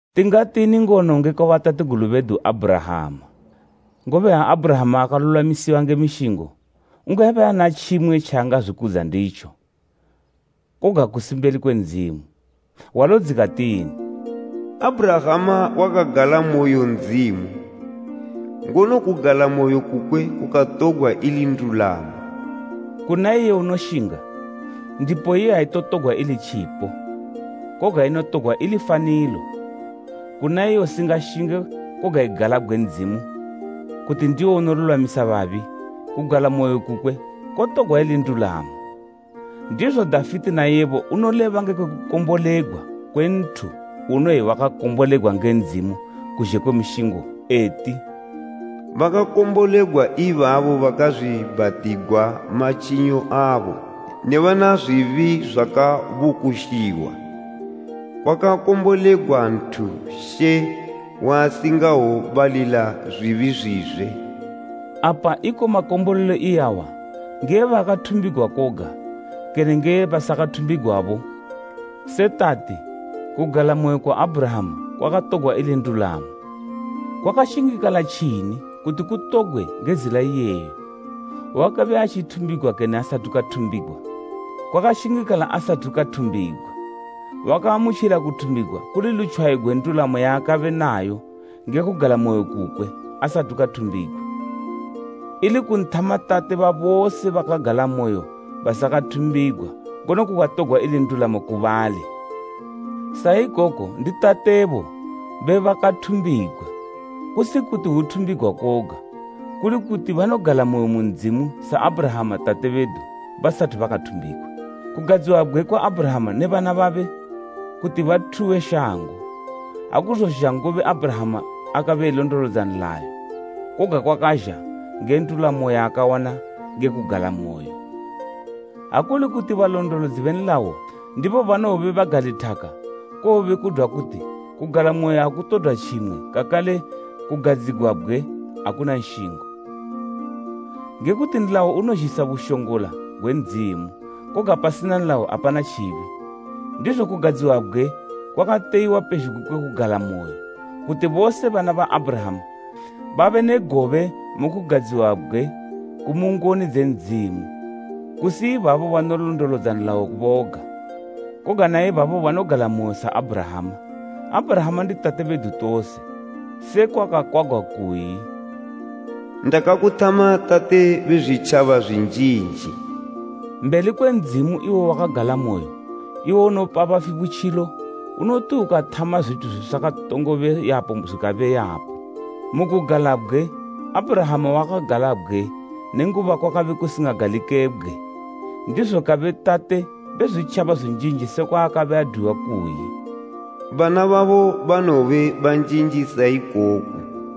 Tingatini ngono ngekwa batategulu bedu, Abhurahama? Ngobe ha Abhurahama akalulwamisiwa nge mishingo, ungabe ana tjimwe tjaangazwikudza nditjo, koga kusi mbeli kwe Ndzimu. Hwalo dzikatini? “Abhurahama wakagalamoyo Ndzimu, ngono kugalamoyo kukwe kukatogwa ili ndulamo.” Kuna iye unoshinga, ndipo iye aitotogwa ili tjipo, koga inotogwa ili fanilo. Kuna iye usingashinge koga egalabgwe Ndzimu, kuti ndiwo unolulwamisa babi, kugalamoyo kukwe kotogwa ili ndulamo. Ndizo Dafite naiye bo unoleba ngekwe kukombolegwa kwe nthu unoyi wakakombolegwa nge Ndzimu kuzhe kwe mishingo eti, “Bakakombolegwa ibabo bakazwiibhatigwa matjinyo abo, ne bana zwibi zwakabukushiwa. Kwakakombolegwa nthu She waasingobalila zwibi zwizwe.” Apa iko makombolelo iyawa nge ebakathumbigwa koga, kene nge ebasakathumbigwabo? Se tati, “Kugalamoyo kwa Abhurahama kwakatogwa ili ndulamo.” Kwakashingikala tjini kuti kutogwe nge zila iyeyo? Wakabe atjithumbigwa kene asathu kathumbigwa? Kwakashingikala asathu kathumbigwa. Wakaamutjila kuthumbigwa kuli lutjwayo gwe ndulamo yaakabe nayo nge kugalamoyo kukwe asathu kathumbigwa. Ili kunthama tate ba bose bakagalamoyo basakathumbigwa ngono kukatogwa ili ndulamo ku bali. Sa ikoko ndi tatebo be bakathumbigwa, kusi kuti hwuthumbigwa koga, kuli kuti banogalamoyo mu Ndzimu sa Abhurahama tate bedu, basathu bakathumbigwa. Kugadziwabgwe kwa Abhurahama ne bana babe kuti bathuwe shango, akuzozha ngobe Abhurahama akabe elondolodza nlayo, koga kwakazha nge ndulamo yaakawana nge kugalamoyo. Ha kuli kuti balondolodzi be nlayo ndibo banowobe bagalithaka, kowobe kudwa kuti kugalamoyo akutodwa tjimwe kakale kugadziwabgwe akuna nshingo. Nge kuti nlayo unozhisa bushongola gwe Ndzimu, koga pasina nlayo apana tjibi. Ndizo kugadziwabgwe kwakateyiwa pezhugwi kwe kugalamoyo kuti bose bana ba Abhurahama babe ne gobe mu kugadziwabgwe kumu ngoni dze Ndzimu, kusi ibabo banolondolodza nlayo boga, koga na ibabo banogalamoyo sa Abhurahama. Abhurahama ndi tate bedu tose. Sekwa kwakakwagwa kuyi, “Ndakakuthama tate be zwitjaba zwi njinji.” Mbeli kwe Ndzimu iwo waakagalamoyo, iwo unopa bafi butjilo, unoti ukathama zwithu zwisakatongobe yapo zwikabe yapo. Mu kugalabgwe, Abhurahama wakagalabgwe nenguba kwakabe kusingagalikebgwe, ndizo kabe “tate be zwitjaba zwinjinji” sekwa akabe adwiwa, kuyi “Bana babo banowobe banjinji sa ikoku.”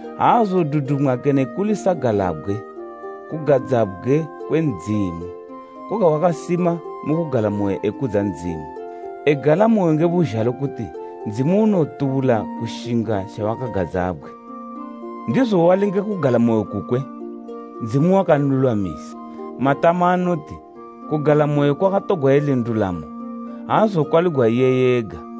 Aazodudumwa kene kuli sagalabgwe kugadzabgwe kwe Ndzimu, koga wakasima mu kugalamoyo, ekudza Ndzimu, egalamoyo nge buzhalo kuti Ndzimu unotubula kushinga tjawakagadzabgwe. Ndizo wali nge kugalamoyo kukwe, “Ndzimu wakalulwamisa.” Matama anoti, “kugalamoyo kwakatogwa ili ndulamo,” aazokwaligwa iye ega.